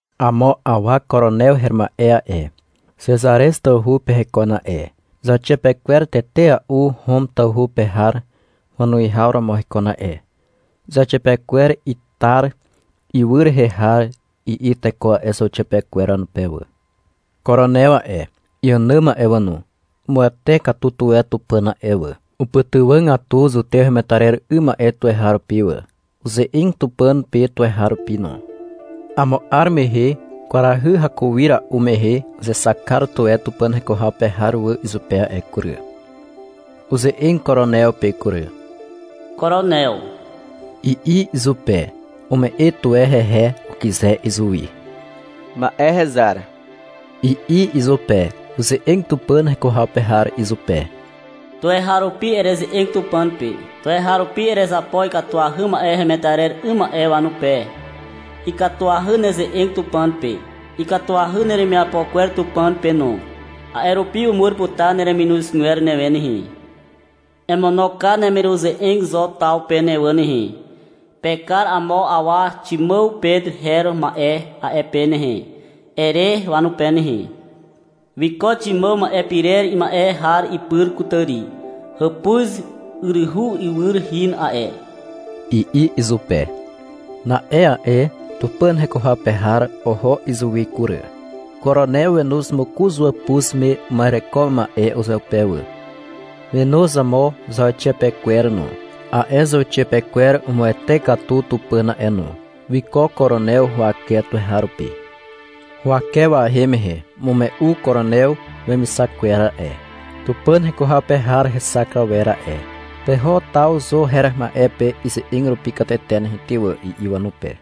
Amo awa Koronew her ma'e a'e, Xezarez tawhu pe hekon a'e. Zauxiapekwer tetea'u Hom tawhu pe har wanuwihaw romo hekon a'e. Zauxiapekwer Itar ywy rehe har, i'i teko a'e zauxiapekwer wanupe wà. Koronew a'e, iànàm a'e wà no, umuwete katu tuwe Tupàn a'e wà. Upytywàgatu zutew hemetarer 'ym ma'e tuweharupi wà. Uze'eg Tupàn pe tuweharupi no. Amo 'ar mehe kwarahy hakuira'u mehe uzexak kar tuwe Tupàn heko haw pe har wà izupe a'e kury. Uze'eg Koronew pe kury. -Koronew, i'i izupe. Ume'e tuwe hehe, ukyze izuwi. — Ma'e, hezar, i'i izupe. Uze'eg Tupàn heko haw pe har izupe. — Tuweharupi ereze'eg Tupàn pe. Tuweharupi erezapo ikatuahy ma'e hemetarer 'ym ma'e wanupe. Ikatuahy neze'eg Tupàn pe. Ikatuahy neremiapo kwer Tupàn pe no. A'e rupi umur putar nereminozgwer newe nehe. Emono kar neremiruze'eg Zo taw pe ne wà nehe. — Pekar amo awa Ximàw Pet her ma'e a'e pe nehe, ere wanupe nehe. Wiko Ximàw ma'e pirer ima'e har ipyr kutàri. Hàpuz yryhu iwyr hin a'e, i'i izupe. Na'e a'e Tupàn heko haw pe har oho izuwi kury. Koronew wenoz mokoz wàpuz me uma'ereko ma'e uzeupe wà, wenoz amo zauxiapekwer no. A'e zauxiapekwer umuwete katu Tupàn a'e no. Wiko Koronew huwake tuweharupi. Huwake wahem mehe umume'u Koronew wemixak kwer a'e, Tupàn heko haw pe har hexak awer a'e. — Peho taw Zo her ma'e pe ize'eg rupi katete nehe ty wà, i'i wanupe.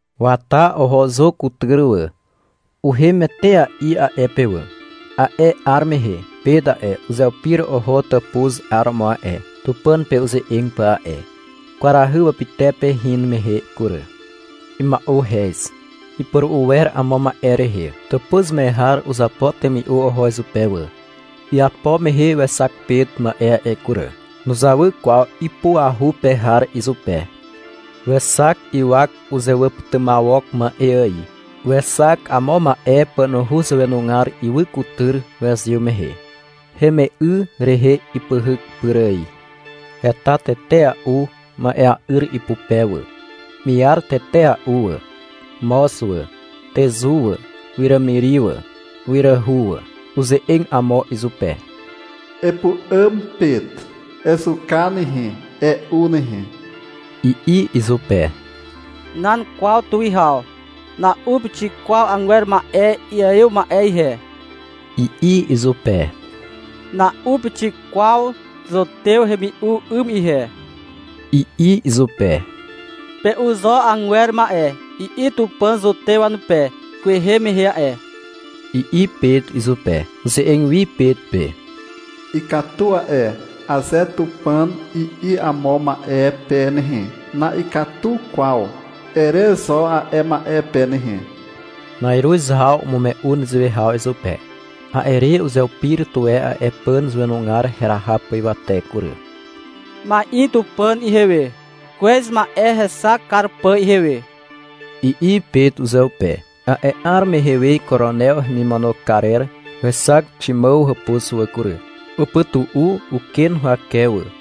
Wata oho Zo kutyr wà. Uhem etea'i a'e pe wà. A'e 'ar mehe Pet a'e, uzeupir oho tàpuz 'aromo a'e, Tupàn pe uze'eg pà a'e. Kwarahy wapytepe hin mehe kury. Ima'uhez. Ipuru'u wer amo ma'e rehe. Tàpuz me har uzapo temi'u oho izupe wà. Iapo mehe wexak Pet ma'e a'e kury. Nuzawy kwaw ipuahu pe har izupe. Wexak ywak uzewàpytymawok ma'e ài. Wexak amo ma'e pànuhu zàwenugar ywy kutyr wezyw mehe. Heme'y rehe ipyhyk pyr ài. Heta tetea'u ma'ea'yr ipupe wà. Miar tetea'u wà, moz wà, tezu wà, wiràmiri wà, wiràhu wà. Uze'eg amo izupe. -Epu'àm, Pet. Ezuka nehe, e'u nehe, i'i izupe. — Nan kwaw tuwihaw. Na'u pixik kwaw agwer ma'e iaiw ma'e ihe, i'i izupe. — Na'u pixik kwaw zutew hemi'u 'ym ihe, i'i izupe. — Pe'u zo agwer ma'e, i'i Tupàn zutew wanupe kwehe mehe a'e, i'i Pet izupe. Uze'eg wi Pet pe. — Ikatu a'e, aze Tupàn i'i amo ma'e pe nehe, — na'ikatu kwaw, ere zo a'e ma'e pe nehe. Na'iruz haw umume'u nezewe haw izupe. A'e re uzeupir tuwe a'e pàn zàwenugar heraha pà ywate kury. — Ma'in Tupàn ihewe, kwez ma'e hexak kar pà ihewe, i'i Pet uzeupe. A'e 'ar mehe we Koronew hemimono karer wexak Ximàw hàpuz wà kury. Upytu'u uken huwake wà.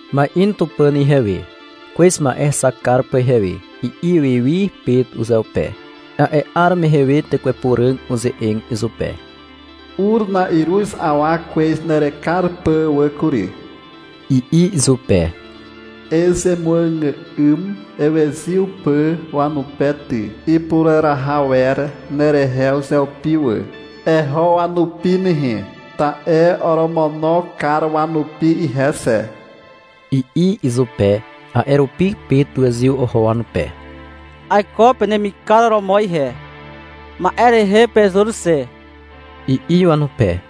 — Ma'in Tupàn ihewe, kwez ma'e hexak kar pà ihewe, i'i wi wi Pet uzeupe. A'e 'ar mehe we Tekwe Puràg uze'eg izupe. — Ur na'iruz awa kwez nerekar pà wà kury, i'i izupe. — Ezemuàgà'ym ewezyw pà wanupe ty. Ipureraha wer nerehe uzeupi wà. Eho wanupi nehe. Ta'e oromono kar wanupi ihe xe, i'i izupe. A'e rupi Pet wezyw oho wanupe. — Aiko penemikar romo ihe. Ma'e rehe pezur xe, i'i wanupe.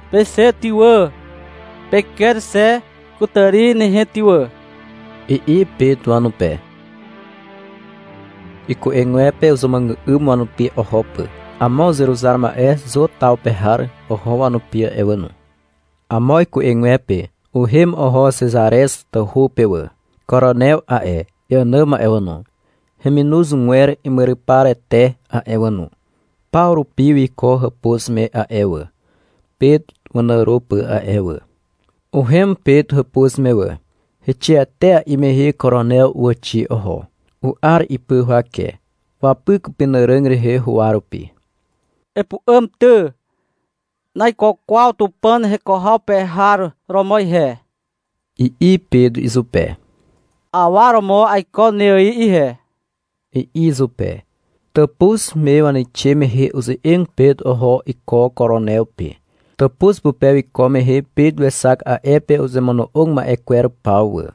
— Peixe ty wà, peker xe kutàri nehe ty wà, i'i Pet wanupe. Iku'egwepe uzemuàgà'ym wanupi oho pà. Amo uzeruzar ma'e Zo taw pe har oho wanupi a'e wà no. Amo iku'egwepe uhem oho Xezarez tawhu pe wà. Koronew a'e, iànàm a'e wà no, heminozgwer imyryparete a'e wà no, paw rupi wiko hàpuz me a'e wà, Pet wanàro pà a'e wà. Uhem Pet hàpuz me wà. Heixe etea'i mehe Koronew uwàxi oho. U'ar ipy huwake. Wapyk upenàràg rehe huwa rupi. — Epu'àm ty, (naiko kwaw Tupàn heko haw pe har romo ihe), i'i Pet izupe. — Awa romo aiko ne ài ihe, i'i izupe. Tàpuz me waneixe mehe uze'eg Pet oho iko Koronew pe. Tàpuz pupe wiko mehe Pet wexak a'e pe uzemono'og ma'e kwer paw wà.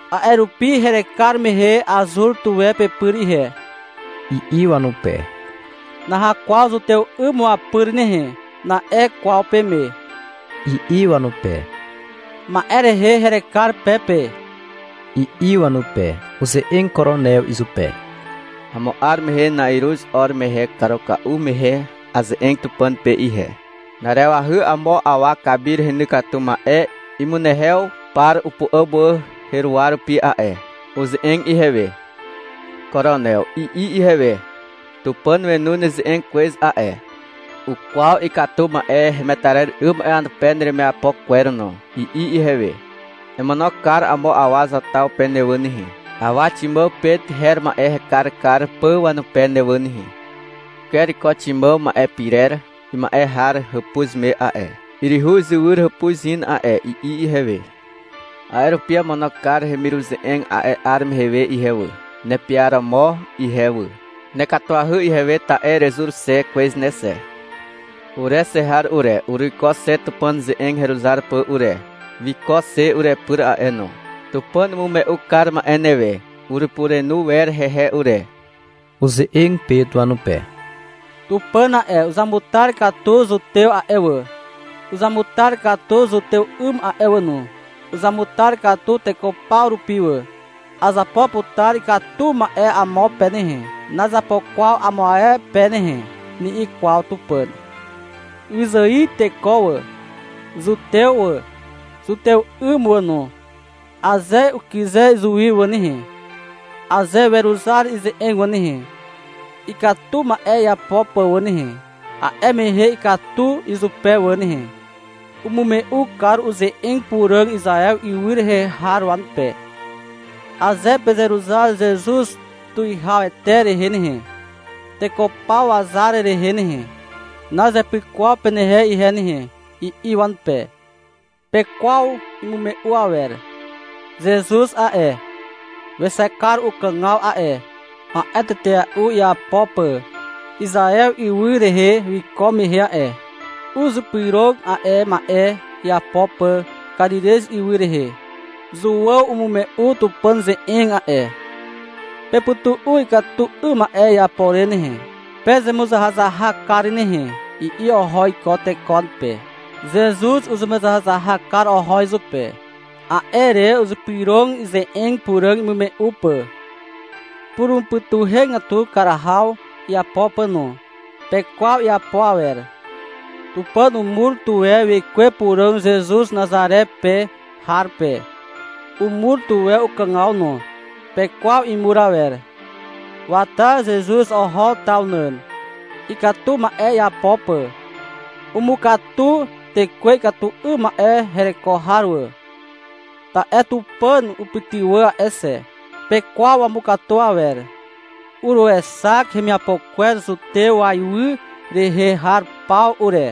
— A'e rupi herekar mehe azur tuwe pepyr ihe, i'i wanupe. -Naha kwaw zutew 'ym wapyr nehe, na'e kwaw peme, i'i wanupe. — Ma'e rehe herekar pe pe, i'i wanupe. Uze'eg Koronew izupe. -Amo 'ar mehe na'iruz 'or mehe karuka'u mehe aze'eg Tupàn pe ihe. Na'arewahy amo awa kamir heny katu ma'e imunehew par upu'àm wà heruwa rupi a'e. Uze'eg ihewe. -Koronew, i'i ihewe. — Tupàn wenu neze'eg kwez a'e. Ukwaw ikatu ma'e hemetarer 'ym ma'e wanupe neremiapo kwer no, i'i ihewe. — Emono kar amo awa Zo taw pe ne wà nehe, awa Ximàw Pet her ma'e hekar kar pà wanupe ne wà nehe. Uker iko Ximàw ma'e pirer ima'e har hàpuz me a'e. Yryhu izywyr hàpuz hin a'e, i'i ihewe. A'e rupi amono kar heremiruze'eg a'e 'ar mehe we ihe wà, nepiaromo ihe wà. Nekatuahy ihewe ta'e erezur xe kwez ne xe. Ure xe har ure, uruiko xe Tupàn ze'eg heruzar pà ure. Wiko xe urepyr a'e no. Tupàn umume'u kar ma'e newe. Urepurenu wer hehe ure. Uze'eg Pet wanupe. -Tupàn a'e, uzamutar katu zutew a'e wà, uzamutar katu zutew 'ym a'e wà no. Uzamutar katu teko paw rupi wà. — Azapo putar ikatu ma'e amo pe nehe, nazapo kwaw amo ae pe nehe, ni'i kwaw Tupàn. Wyzài teko wà, zutew wà, zutew 'ym wà no, aze ukyze izuwi wà nehe, aze weruzar ize'eg wà nehe, ikatu ma'e iapo pà wà nehe, a'e mehe ikatu izupe wà nehe. Umume'u kar uze'eg puràg Izaew ywy rehe har wanupe. — Aze pezeruzar Zezuz Tuwihawete rehe nehe, teko paw wazar rehe nehe, nazepyk kwaw penehe ihe nehe, i'i wanupe. Pekwaw imume'u awer. Zezuz a'e, wexak kar ukàgaw a'e, ma'e tetea'u iapo pà Izaew ywy rehe wiko mehe a'e. Uzypyrog a'e ma'e iapo pà Karirez ywy rehe. Zuàw umume'u Tupàn ze'eg a'e, — Pepytu'u ikatu 'ym ma'e iapo re nehe. Pezemuzahazahak kar nehe, i'i oho iko teko wanupe. Zezuz uzemuzahazahak kar oho izupe. A'e re uzypyrog ze'eg puràg imume'u pà, purumupytuhegatu kar haw iapo pà no. Pekwaw iapo awer. Tupàn umur tuwe Wekwe Puràg Zezuz Nazare pe har pe. Umur tuwe ukàgaw no. Pekwaw imur awer. Wata Zezuz oho taw nàn, ikatu ma'e iapo pà. Umukatu tekwe ikatu 'ym ma'e hereko har wà, ta'e Tupàn upytywà a'e xe. Pekwaw wamukatu awer. Uruexak hemiapo kwer zutew waiwy rehe har paw ure,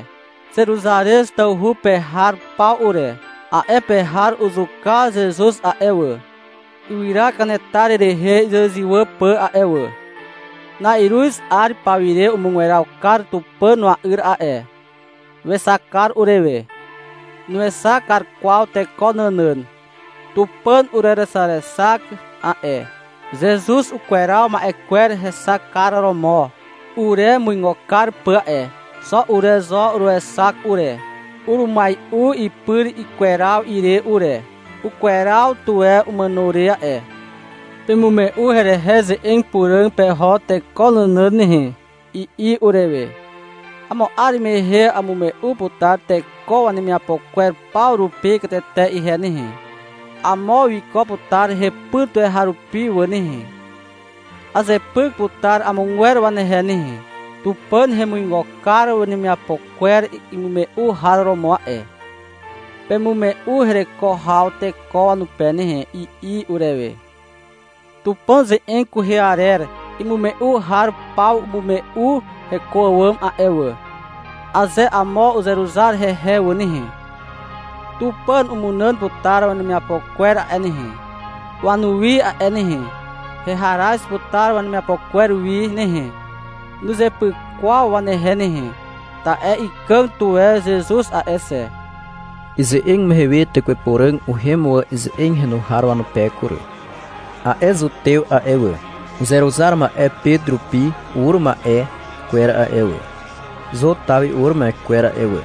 Zeruzarez tawhu pe har paw ure. A'e pe har uzuka Zezuz a'e wà, ywyra kanetar rehe izywàzywà pà a'e wà. Na'iruz 'ar pawire umugweraw kar Tupàn wa'yr a'e. Wexak kar urewe. Nuexak kar kwaw teko nànàn. Tupàn urerexarexak a'e, Zezuz ukweraw ma'e kwer hexak kar romo uremuigo kar pà a'e. Xo ure zo uruexak ure. Urumai'u ipyr ikweraw ire ure. (Ukweraw tuwe umàno re a'e.) — Pemume'u herehe ze'eg puràg peho teko nànàn nehe, i'i urewe. — Amo 'ar mehe amume'u putar teko wanemiapo kwer paw rupi katete ihe nehe. Amo wiko putar hepyr tuweharupi wà nehe. Azepyk putar amogwer wanehe nehe. Tupàn hemuigo kar wanemiapo kwer imume'u har romo a'e. Pemume'u hereko haw teko wanupe nehe, i'i urewe. Tupàn ze'eg kwehe arer imume'u har paw umume'u heko àwàm a'e wà. — Aze amo uzeruzar hehe wà nehe, Tupàn umunàn putar wanemiapo kwer a'e nehe, wanuwi a'e nehe. Heharaz putar wanemiapo kwer wi nehe. Nuzepyk kwaw wanehe nehe. Ta'e ikàg tuwe Zezuz a'e xe. Ize'eg mehe we Tekwe Puràg uhem wà ize'eg henu har wanupe kury. A'e zutew a'e wà, uzeruzar ma'e Pet rupi ur ma'e kwer a'e wà, Zo taw wi ur ma'e kwer a'e wà,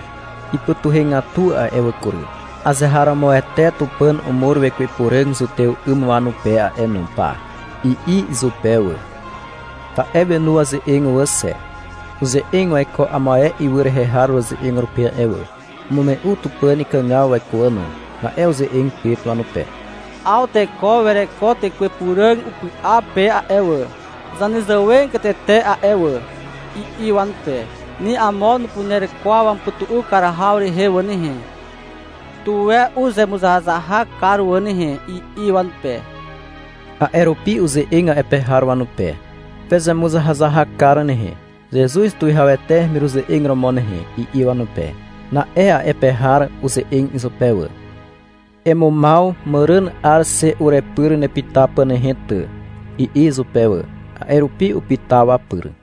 ipytuhegatu a'e wà kury. — Azeharomoete Tupàn umur Wekwe Puràg zutew 'ym wanupe a'e no pa, i'i izupe wà. Ta'e wenu waze'eg wà xe. Uze'eg waiko amo ae ywy rehe har waze'eg rupi a'e wà. Umume'u Tupàn ikàgaw waiko wà no. Na'e uze'eg Pet wanupe. — 'Aw teko wereko Tekwe Puràg upy'a pe a'e wà, zanezàwegatete a'e wà, i'i wanupe. — Ni amo nupuner kwaw wamupytu'u kar haw rehe wà nehe. Tuwe uzemuzahazahak kar wà nehe, i'i wanupe. A'e rupi uze'eg a'e pe har wanupe. -Pezemuzahazahak kar nehe, Zezuz Tuwihawete hemiruze'eg romo nehe, i'i wanupe. Na'e a'e pe har uze'eg izupe wà. — Emumaw màràn 'ar xe urepyr nepyta pà nehe, ty, i'i izupe wà. A'e rupi upyta wapyr.